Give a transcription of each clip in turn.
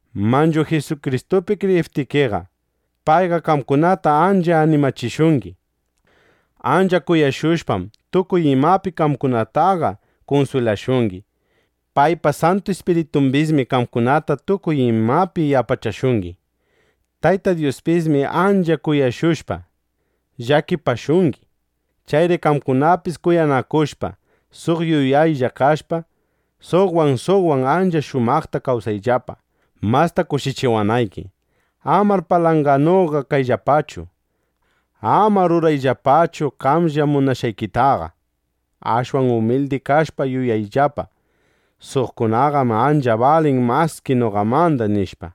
Manchu Jisukristupi kriyiptikiqa, payqa qamkunata ancha animachishungi. Ancha kuyashushpam, tukuy imapi qamkunataqa kunswilashungi. Paypa Santu Ispiritumbismi qamkunata tukuy imapi yapachashungi. Tayta Dyuspismi ancha kuyashushpa, llakipashungi. Chayri qamkunapis kuyanakushpa, suq yuyaylla kashpa, suqwan suqwan ancha shumaqta kawsayllapa, masta kushichiwanayki. Amar palanganuqa kayllapachu. Amar rurayllapachu qamlla munashqaykitaqa. Ashwan umilidi kashpa yuyayllapa: Suqkunaqam ancha balin maski noqamanda, nishpa.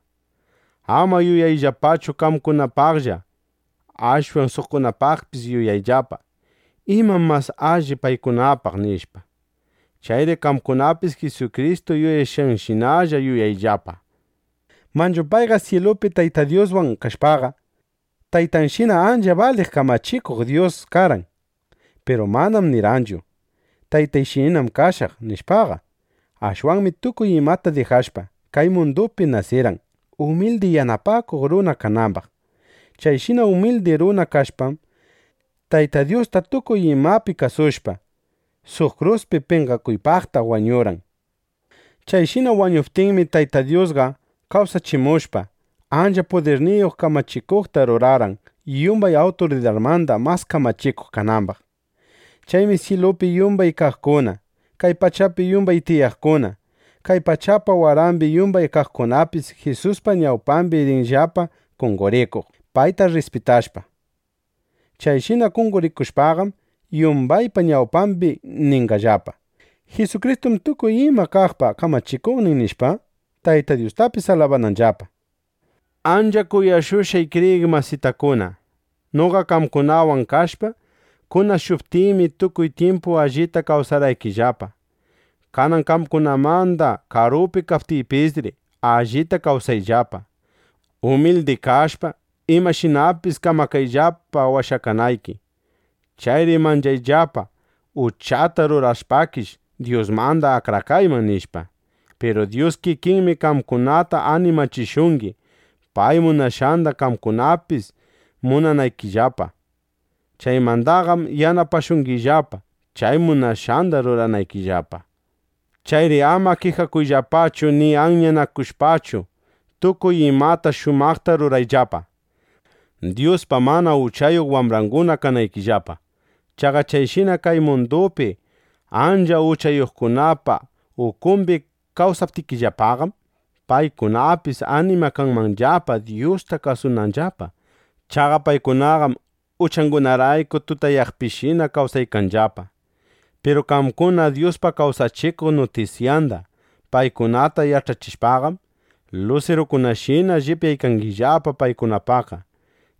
Amar yuyayllapachu qamkunapaqllaqa. Ashwan suqkunapaqpis yuyayllapa: ¿Imam mas alli paykunapaq? nishpa. Chayri qamkunapis Jisukristu yuyashqanshinalla yuyayllapa. Manchu payqa syilupi Tayta Dyuswan kashpaqa, Taytanshina ancha baliq kamachikuq Dyus karqan. Piru manam nirqanchu: “Taytayshinallam kashaq”, nishpaqa. Ashwanmi tukuy imata dijashpa, kay mundupi nasirqan, umildi yanapakuq runa kanambaq. Chayshina umildi runa kashpam, Tayta Dyusta tukuy imapi kasushpa, suq kruspi penqakuypaqta wañurqan. Chayshina wañuptinmi, Tayta Dyusqa kawsachimushpa, ancha pudirniyuq kamachikuqta rurarqan, yumbay awturidarmanda mas kamachikuq kanambaq. Chaymi syilupi yumbay kaqkuna, kay pachapi yumbay tiyaqkuna, kay pachapa warambi yumbay kaqkunapis Jisuspa ñawpambi rinllapa qonqorikuq, payta rrispitashpa. Chayshina qonqorikushpaqam, yumbaypa ñawpambi ninqallapa: “Jisukristum tukuy ima kaqpa kamachikuqnin”, nishpa, Tayta Dyustapis alabananllapa. Ancha kuyashqay kriyiq masitakuna, noqa qamkunawan kashpa kunashuptiymi, tukuy tyimpu allita kasuwarqaykillapa. Kanan qamkunamanda karupi kaptiypisri, allita kasuwayllapa. Umildi kashpa, imashinapis kamakayllapa washakanayki. Chayri manchayllapa: Uchata rurashpakish, Dyusmanda akrakayman, nishpa. Piru Dyus kikinmi qamkunata animachishungi, pay munashqanda qamkunapis munanaykillapa. Chaymandaqam yanapashungillapa, chay munashqanda ruranaykillapa. Chayri ama kijakushpachu ni anyanakushpachu, tukuy imata shumaqta rurayllapa, Dyuspa mana uchayuq wambranguna kanaykillapa. Chaqa chayshina kay mundupi ancha uchayuqkunapa ukumbi kawsaptikillapaqam, paykunapis animakanmanllapa, Dyusta kasunanllapa. Chaqa paykunaqam uchangunarayku tutayaqpishina kawsaykanllapa. Piru qamkuna Dyuspa kawsachikuq nutisyanda paykunata yach'achishpaqam, lusirukunashina llipyaykangillapa paykunapaqqa.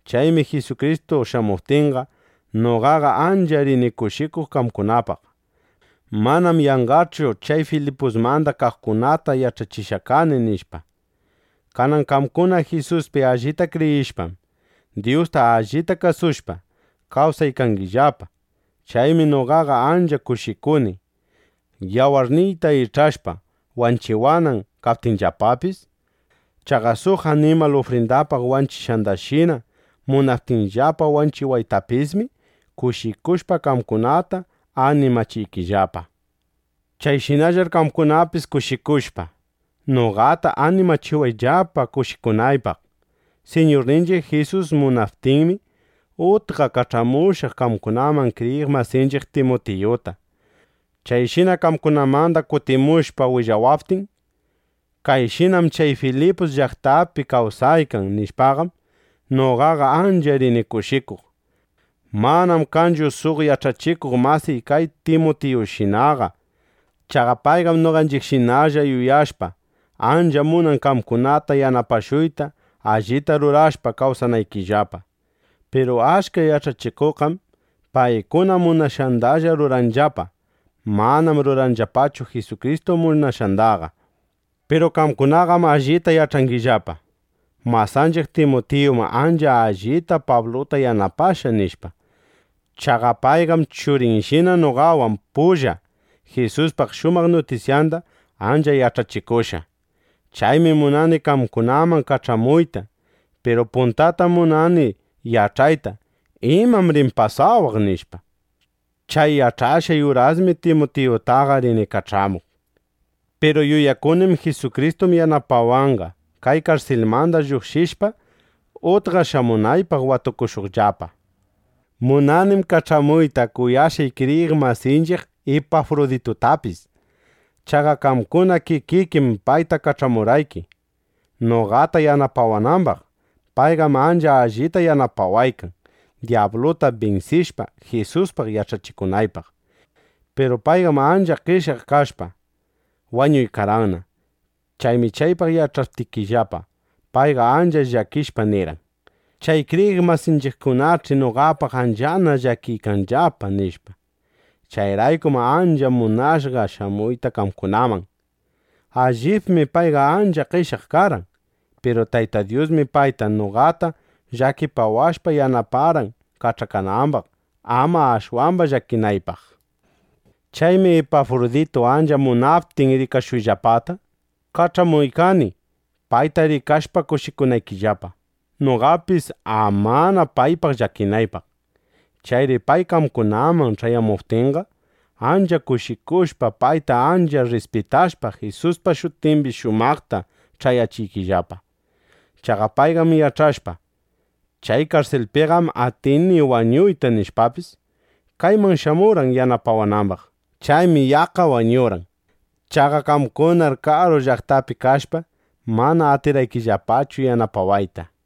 Chaymi Jisukristu shamuptinqa, noqaqa ancha rini kushikuq qamkunapaq: Manam yanqachu chay Filipusmanda kaqkunata yach'achishqa kani, nishpa. Kanan qamkuna Jisuspi allita kriyishpam, Dyusta allita kasushpa, kawsaykangillapa. Chaymi noqaqa ancha kushikuni, yawarniyta ich'ashpa, wanchiwanan kaptinllapapis. Chaqa suq animal ufrindapaq wanchishqandashina munaptinllapa wanchiwaytapismi, kushikushpa qamkunata animachiykillapa. Chayshinallar qamkunapis kushikushpa, noqata animachiwayllapa kushikunaypaq. Siñurninchiq Jisus munaptinmi, utqa kach'amushaq qamkunaman kriyiq masinchiq Timutiyuta. Chayshina qamkunamanda kutimushpa willawaptin: “Kayshinam chay Filipus llaqtapi kawsaykan”, nishpaqam, noqaqa ancha rini kushikuq. Manam kanchu suq yach'achikuq masiy kay Timutiyushinaqa. Chaqa payqam noqashinalla yuyashpa, ancha munan qamkunata yanapashuyta, allita rurashpa, kawsanaykillapa. Piru achka yach'achikuqqam paykuna munashqandalla ruranllapa. Manam ruranllapachu Jisukristu munashqandaqa. Piru qamkunaqam allita yach'angillapa: Masanchiq Timutiyum ancha allita Pabluta yanapashqa, nishpa. Chaqa payqam churiyshina noqawan pulla Jisuspa shumaq nutisyanda ancha yach'achikushqa. Chaymi munani qamkunaman kach'amuyta. Piru puntatam munani yach'ayta: ¿Imam rin pasawaq? nishpa. Chay yach'ashqay urasmi Timutiyutaqa rini kach'amuq. Piru yuyakunim: Jisukristum yanapawanqa, kay karsilmanda lluqshishpa, utqa shamunaypaq watukushuqllapa. Munanim kach'amuyta kuyashqay kriyiq masinchiq Ipafruditutapis. Chaqa qamkuna kikikim payta kach'amurqayki, noqata yanapawanambaq. Payqam ancha allita yanapawaykan, dyabluta binsishpa, Jisuspaq yach'achikunaypaq. Piru payqam ancha qeshyaq kashpa, wañuykarqanna. Chaymi chaypaq yach'aptikillapa, payqa ancha llakishpa nirqan: “Chay kriyiq masiykunach'i noqapaq anchana llakiykanllapa”, nishpa. Chayraykum ancha munashqa shamuyta qamkunaman. Allibmi payqa ancha qeshyaq karqan. Piru Tayta Dyusmi payta, noqata llakipawashpa, yanaparqan kach'akanambaq, ama ashwamba llakinaypaq. Chaymi Ipafruditu ancha munaptin rikashuyllapata, kach'amuykani, payta rikashpa kushikunaykillapa, noqapis amana paypaq llakinaypaq. Chayri pay qamkunaman ch'ayamuptinqa, ancha kushikushpa, payta ancha rrispitashpa, Jisuspa shutimbi shumaqta ch'ayachiyllapa. Chaqa payqam yach'ashpa: Chay karsilpiqam atini wañuyta, nishpapis, kayman shamurqan yanapawanambaq. Chaymi yaqqa wañurqan. Chaqa qamkunaqar karu llaqtapi kashpa, mana atirqaykillapachu yanapawayta.